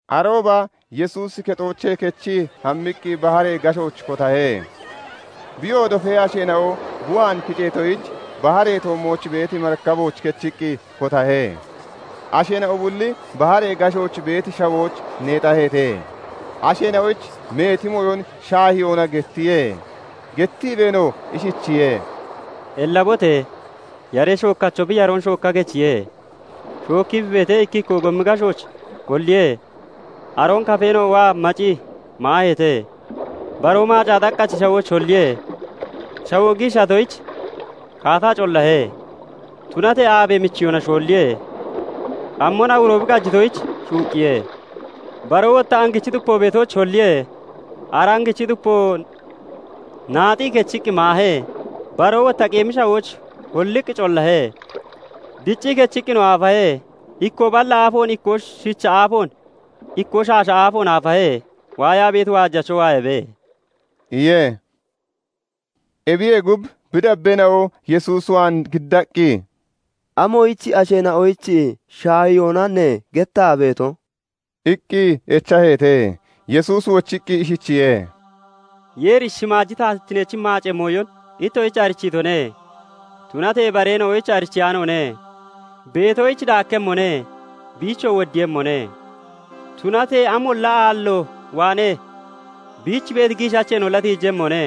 Arooba Yesuusi kexoochee kechii hammiqqi baharee gashooch kotahe. Biyoo dofee asheena'o bi waan kiceetoyich, baharee toommooch beeti marikabooch kechiqqi kotahe. Asheena'o bulli baharee gashooch beeti shawooch neexaheete. Asheena'oyich meeti mooyon shaahiyoona gettiye. gettiibeenoo ishichiye:- "Ellabote! Yaree shookkacho bi yaroon shookka kechiye. Shookkii bi beetee, ikkikkoo gomi gashooch holliye. Aroon kafeena'o waa macii maaheete. Baroo maacaa xaqqachi shawooch holliye. Shawoo giishatoyich kaataa collahe; Tunatee aabe michiyona shoolliye; cammon awuro bi qajitoyich, shuuqqiye. Baroo wotta angichi xupo beetooch holliye; ara angichi xupoo naaxii (nocii) kechiqqi maahe. Baroo wotta qeemi shawooch holliqqi collahe; dccii kechiqqinoo aafahe; ikkoo balla aafoon, ikkoo shicha aafoon, ikkoo shaasha aafoon aafahe. Waayaa beeti waajacho waayabe" iye. Ebiye gub, bi dabbeena'o Yesuus waan giddaqqi, "Amoyichiye asheena'oyich shaahiyoona ne gettaa beeto?" iqqi echaheete. Yesuusi wochiqqi ishichiye:- "Yeeri shimaaji taatittineech maacee mooyon ittoshich arichiitone; tunatee bareena'oyich arichiyaanoone. Beetoyich daakkemmone; biichoo woddiiyemmone. Tunatee amolla aallo waanee biich beeti giishacheenolla tiijemmone.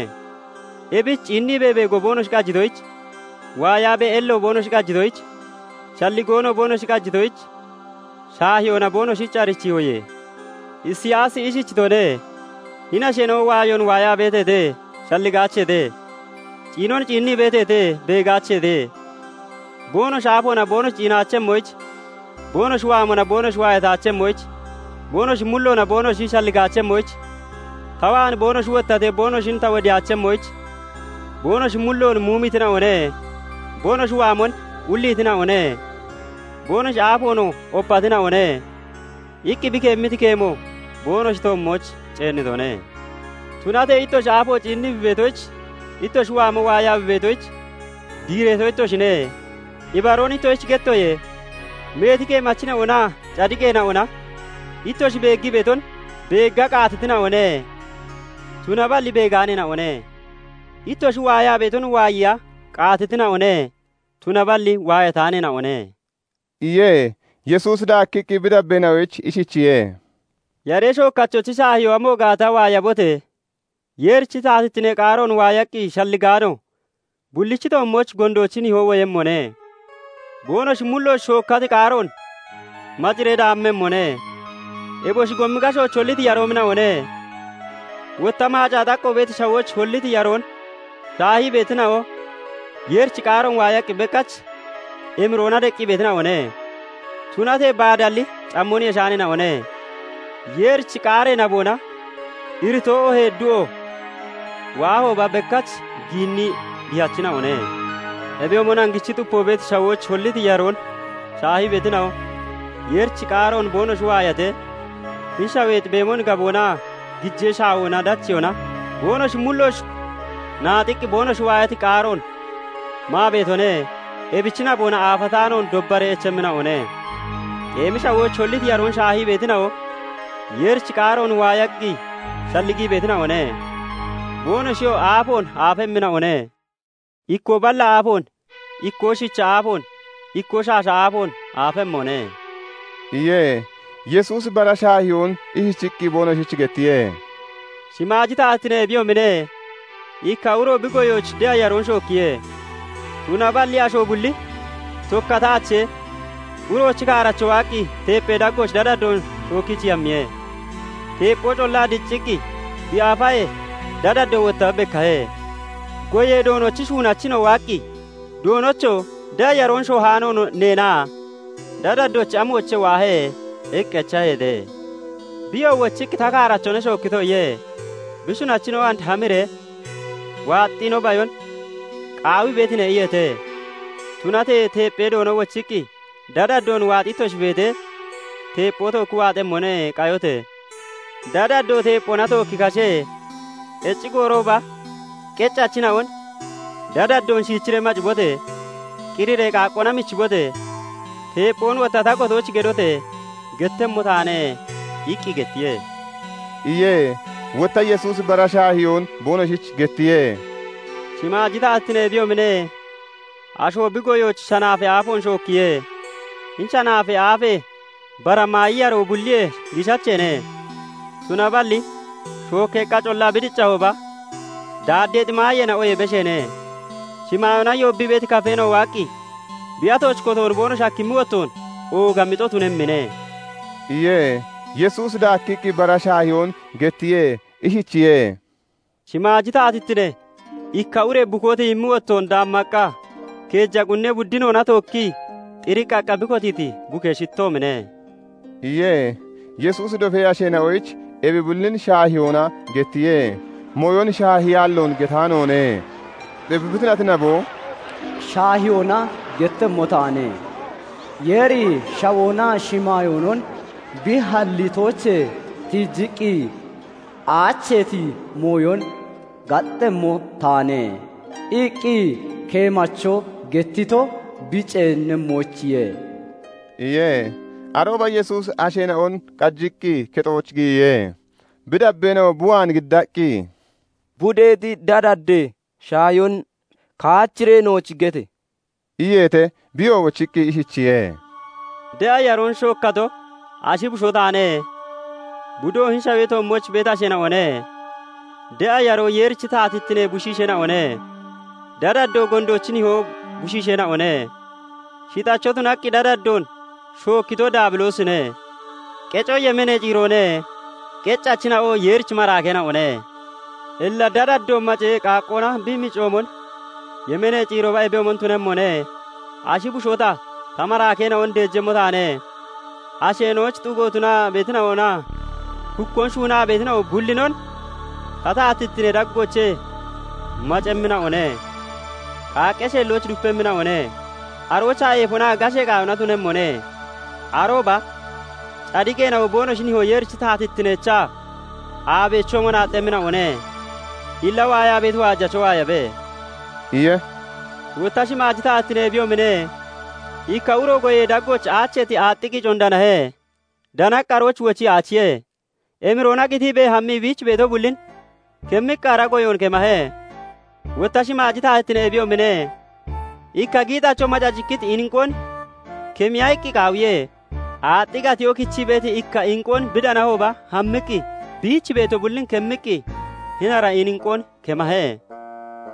Ebich ciinniibee beego boonoshi qajitoyich, waayaabee ello boonoshi qajitoyich, shalligoonoo boonoshi qajitoyich shaahiyoona boonoshich arichiihoye. Isiyaasi ishichitone; 'Hini asheena'o waayoon waayaa beeteete; shalligaacheete. ciinon ciinnii beeteete; beegaacheete. Boonoshi aafoona boonoshi ciinaachemmoyich, boonoshi waamona boonoshi waayataachemmoyich, boonoshi mulloona boonoshi shalligaachemmoyich, ta waan boonoshi wottatee boonoshin ta wodiyaachemmoyich, boonoshi mulloon muumiitina'one; boonoshi waamon ulliitina'one; boonoshi aafoonoo opatina'one' iqqi bi keemmiti keemo boonoshi toommooch ceennitone. "Tunatee ittoshi aafo ciinnii bi beetoyich, ittoshi waamoo waayaa bi beetoyich, diireeto ittoshine. Ibaroon ittoshich gettoye; meeti keemachina'onaa cadiqeena'ona ittoshi beeggii beeton beegga qaatitina'one; tunaballi beegaaneena'one; ittoshi waayaa beeton waayiya qaatitina'one; tunaballi waayataaneena'one" iye. Yesuusi daakkiqqi bi dabbeena'oyich ishichiye:- "Yaree shookkachochi shaahiyoo amo gaata waayabote! Yeerichi taatittinee qaaroon waayaqqi shalligaano bullichi toommooch gondoochi nihoo woyemmone; boonoshi mullooch shookkati qaaroon maciree daamemmone; eboshi gomi gashooch holliti yaroomina'one. Wotta maacaa xaqqo beeti shawooch holliti yaroon shaahii beetina'o, Yeerichi qaaroon waayaqqi bekkach emiroona deqqi beetina'one. Tunatee baadalli cammon yeshaaneena'one; Yeerichi qaaree naboona iritoo oohee du'o waahooba bekkach giinnii dihachina'one. Ebiyoomon angichi xupo beeti shawooch holliti yaroon shaahii beetina'o, Yeerichi qaaroon boonoshi waayatee, hini shaweexi beemon gaboonaa gijee shaawona dacheyoona boonoshi mullooch naaxiqqi boonoshi waayati qaaroon maa beetone; ebichi naboona aafataanoon dobbaree echemmina'one. Qeemi shawooch holliti yaroon shaahii beetina'o, Yeerichi qaaroon waayaqqi shalligii beetina'one. Boonoshiyoo aafoon aafemmina'one; ikkoo balla aafoon, ikkoo shicha aafoon, ikkoo shaasha aafoon aafemmone" iye. Yesuusi bara shaahiyoon ishichiqqi boonoshich gettiye:- "Shimaaji taatittine ebiyoomine; ikka uro bi goyooch de'a yaroon shookkiye. Tunaballi asho bulli tokkataachee, uroochi kaaracho waaqqi tepphee daggooch dadaddoon shookkichii hammiye. Teepphoo collaa dccikkii bi aafahee, dadaddoo wotta bekkahe. "Goyee Doonochi shuunachina'o waaqqi, 'Doonocho! De'a yaroon shoohaano neena? Dadaddochi amoochee waahe?' iqqi echaheete. "Biyoo wochiqqi, 'Ta kaarachone shookkito' iye. "Bi shuunachina'o 'And hamiree waaxi no bayon qaawii beetine?' iyeete. "Tunatee teepphee Doono wochiqqi, 'Dadaddoon waaxii ittoshi beetee teepphoo tookki waaxemmone; qayote! Dadaddoo teepphoona tookki kashe; qecci goorooba qeccachina'on "Dadaddoon shiichiree macibote! Qiriree qaaqqoona michibote! Teepphoon wotta ta gotooch gedote!" gettemmo taane' iqqi gettiye" iye. Wotta Yesuusi bara shaahiyoon boonoshich gettiye:- "Shimaaji taatittine ebiyoomine; asho bi goyooch shanaafee aafoon shookkiye. Hini shanaafee aafe bara maayi yaroo bulliyee giishacheene; tunaballi shookkeeqqa collaa bi diccahooba daaddeexi maayeena'oyee besheene. Shimaayoona yoobbii beeti kafeena'o waaqqi bi atooch kotoon boonoshi hakkimmi wottoon ooga mixo tunemmine" iye. Yesuusi daakkiqqi bara shaahiyoon gettiye; ishichiye:- "Shimaaji taatittine ikka ure bukoo tiyimmi wottoon daammaqqa keeja qunnee buddinoona tookkii xiriqqaqqa bi kotiiti bukee shittoomine" iye. Yesuusi dofee asheena'oyich ebi bullin shaahiyoona gettiye; mooyon shaahiyaalloon getaanoone. Ebi bi tunati nabo "Shaahiyoona gettemmo taane; Yeeri shawoonaa shimaayoonon bi hallitoochee tiijiqqi aacheeti mooyon gaxxemmo taane" iqqi keemacho gettito bi ceenemmoyichiye" iye. Arooba Yesuusi asheena'on qajiqqi kexooch giyiye. Bi dabbeena'o bi waan giddaqqi, "Budeexi dadaddee shaahiyoon kaachiree nooch gete!" iyeete. Biyoo wochiqqi ishichiye:- "De'a yaroon shookkato ashi bushoo taane; budoo hini shawee toommooch beeti asheena'one. De'a yaroo Yeerichi taatittinee bushiisheena'one; dadaddoo gondoochi nihoo bushiisheena'one. Shixacho tunaqqi dadaddoon shookkito Daabiloosine; qeco yemeenee ciiroone; qeccachina'oo Yeerichi maraakeena'one. "Illa dadaddo macee qaaqqoona bi micoomon, yemeenee ciirooba ebiyoomon tunemmone. Ashi bushoo ta, ta maraakeena'on deejemmo taane; asheena'oyich xugo tunaa beetina'onaa hukkoon shuunaa beetina'o bullinon ta taatittinee daggoochee macemmina'one; qaaqqee sheellooch dupemmina'one; aroochaa eefonaa gashee qaayona tunemmone. Arooba cadiqeena'o boonoshi nihoo Yeerichi taatittineecha aabeechoomon aaxxemmina'one. Illa waayaa beeti waajacho waayabe" iye. "Wotta shimaaji taatittine ebiyoomine; ikka uro goyee daggooch aacheeti aaxxi qiicoon danahe. Danaqqi arooch wochii aachiye. Emiroona qitiibee hammii biich beeto bullin kemmiqqi ara goyoon kemahe. "Wotta shimaaji taatittine ebiyoomine; ikka giixacho macacikkiti inqoon kemiya iqqi qaawiye. Aaxxi gatiyoo kichii beeti ikka inqoon bi danahooba hammiqqi biich beeto bullin kemmiqqi hini ara inqoon kemahe"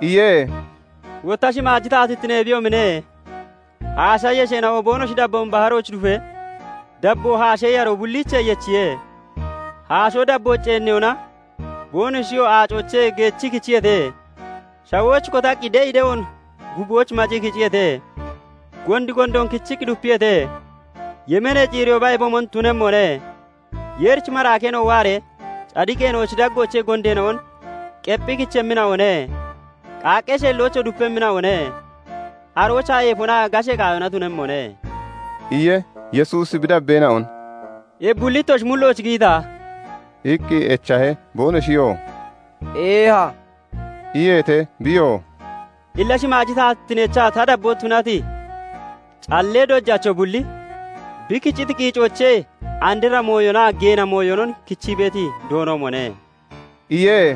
iye. "Wotta shimaaji taatittine ebiyoomine; haasha yesheena'o boonoshi dabboon baharooch dufee, dabboo haashee yaroo bulliichee yechiye. Haashoo dabbooch ceenniyona, boonoshiyoo aacoochee geechii kichiyeete; shawooch kotaqqi de'i de'oon guubooch macii kiciyeete; gondi gondoon kichiqqi dupiyeete. Yemeenee ciirooba ebiyoomon tunemmone; Yeerichi maraakeena'o waaree cadiqeena'ochi daggoochee gondeena'on qephi kichemmina'one; qaaqqee sheellooch dupemmina'one; aroochaa eefonaa gashee qaayona tunemmone" iye. Yesuusi bi dabbeena'on "Ebi bulli ittoshi mullooch giyita?" iqqi echahe. Boonoshiyoo "Eeha" iyeete. Biyoo "Illa shimaaji taatittineecha ta dabboo tunati callee dojacho bulli, bi kiciti qiicoochee andra mooyonaa geena mooyonon kichii beeti doonoomone" iye.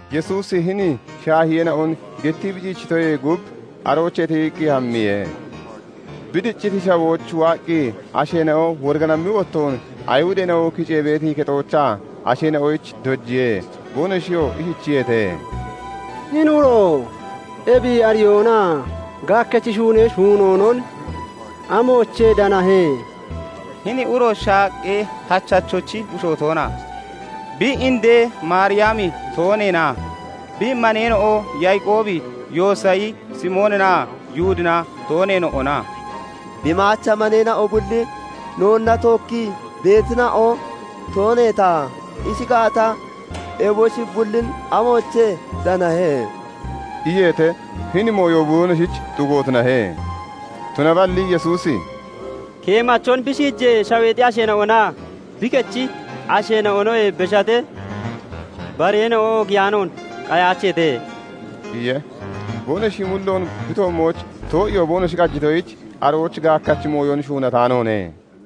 Yesuusi hini shaahiyeena'on gettii bi ciichitoyee gub aroochee tiyiqqi hammiye. Bi dicciti shawooch waaqqi asheena'o woriganammi wottoon Ayihudeena'o kicee beeti kexoochaa asheena'oyich dojiye. Boonoshiyoo ishichiyeete:- "Hini uro ebi ariyoonaa gaakkachi shuunee shuunoonon amoochee danahe? Hini uro shaaqqee hachachochi bushoo toona? Bi indee Maariyami tooneena? Bi maneena'o Yaaqoobi, Yoosayi, Simooninaa Yihudina tooneena'ona? Bi maacha maneena'o bulli noonna tookkii beetina'o tooneeta? Ishi gaata, eboshi bullin amoochee danahe?" iyeete. Hini mooyo boonoshich xugo tunahe. Tunaballi Yesuusi "Keemachon bi shiijee shaweexi asheena'onaa bi kechi asheena'onoyee beshatee bareena'o oogiyaanoon qayaacheete" iye. Boonoshi mulloon bi toommooch too'iyoo boonoshi qajitoyich, arooch gaakkachi mooyon shuunataanoone.